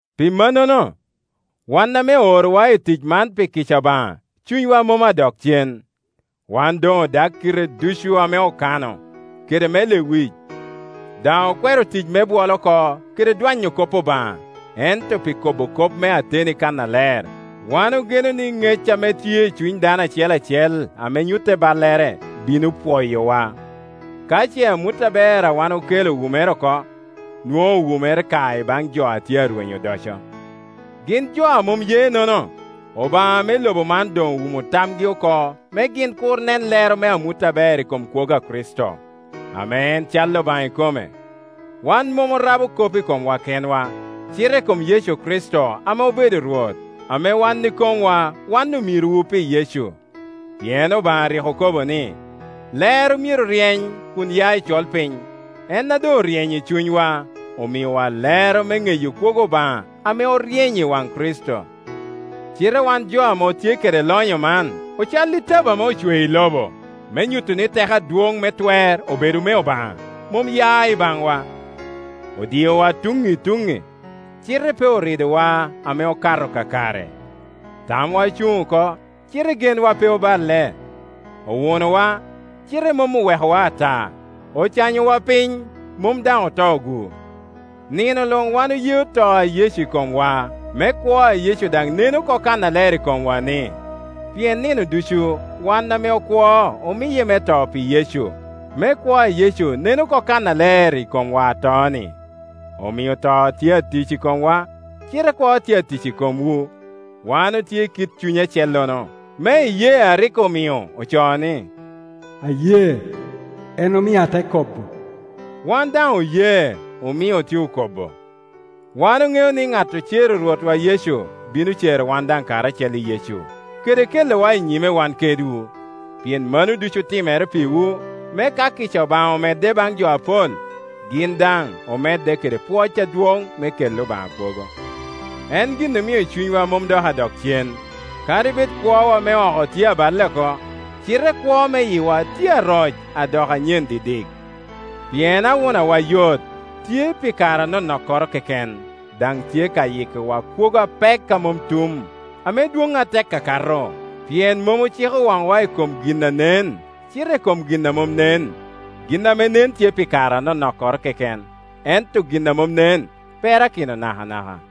Pi mannono, wan ame oorowa i tic man pi kica Obaŋa cunywa mom dok adok cen. Wan doŋ odag kite ducu ame okano, kede me lewic; daŋ okwero tic me bwol oko kede dwanyo kop Obaŋa, ento pi kobo kop me ateni kannaler wan ogeno ni ŋec ame tye i cuny dano acel acel ame nyutte ballere bino pwoyowa. Ka ce amut aber a wan okelo owumere oko, nwoŋo owumere ka i baŋ jo a tye arwenyo odoco. Gin jo a mom ye-nono, obaŋa me lobo man doŋ owumo tamgi oko me gin kur nen lero me amut aber i kom kwogo a Kricito, ame en cal Obaŋa ikome. Wan mom orabo kop i komwa kenwa, cite i kom Yecu Kricito ame obedo Rwot, ame wan ikomwa wan omirowu pi Yecu. Pien Obaŋa a rik okobo ni, “Lero myero ryeny kun ya i colpiny”, en a doŋ oryeny i cunywa, omiowa lero me ŋeyo kwogo Obaŋa ame oryeny i waŋ Kricito. Cite wan jo ame otye kede lonyo man ocal i tabo ame ocweo i lobo, me nyuto ni teko adwoŋ me twer obedo me Obaŋa, mom ya i baŋwa. Odiowa tuŋŋi i tuŋŋi, cite pe oridowa ame okato kakare; tamwa ocuŋ oko, cite genwa pe oballe; owunowa cite mom owekowa ata; ocanyowa piny, mom daŋ oto-gu. Nino luŋ wan oyeo to a Yecu i komwa, me kwo a Yecu daŋ nen oko kannaler i komwa-ni. Pien nino ducu wan ame okwo omiye me to pi Yecu, me kwo a Yecu nen oko kannaler i komwa ato-ni. Omio to tye atic i komwa, cite kwo tye atic i komwu. Wan otye i kit cuny acellono, me iyee a rik omio ocoo ni, “Aye, en omio ate kobo”; wan daŋ oye, omio otye okobo. Wan oŋeo ni ŋat ocero Rwotwa Yecu bino cero wan daŋ karacel i Yecu, kede kelowa i nyime wan kedwu. Pien mano ducu otimere pirwu, me ka kica Obaŋa omedde baŋ jo apol, gin daŋ omedde kede pwoc adwoŋ ame kelli Obaŋa kwogo. En gin omio cunywa mom dok adok cen. Kadi bed kwowa me oko tye aballe oko, cite kwo me yiwa tye aroc, adoko anyen didik. Pien awunawa yot, tye pi kare anonokkoro keken, daŋ tye ka yikkiwa kwogo apek a mom tum, ame dwoŋ atek akato; pien mom ociko waŋwa i kom gin a nen, cite i kom gin a mom nen. Gin ame nen tye pi kare anonokkoro keken, ento gin a mom nen perakino nakanaka.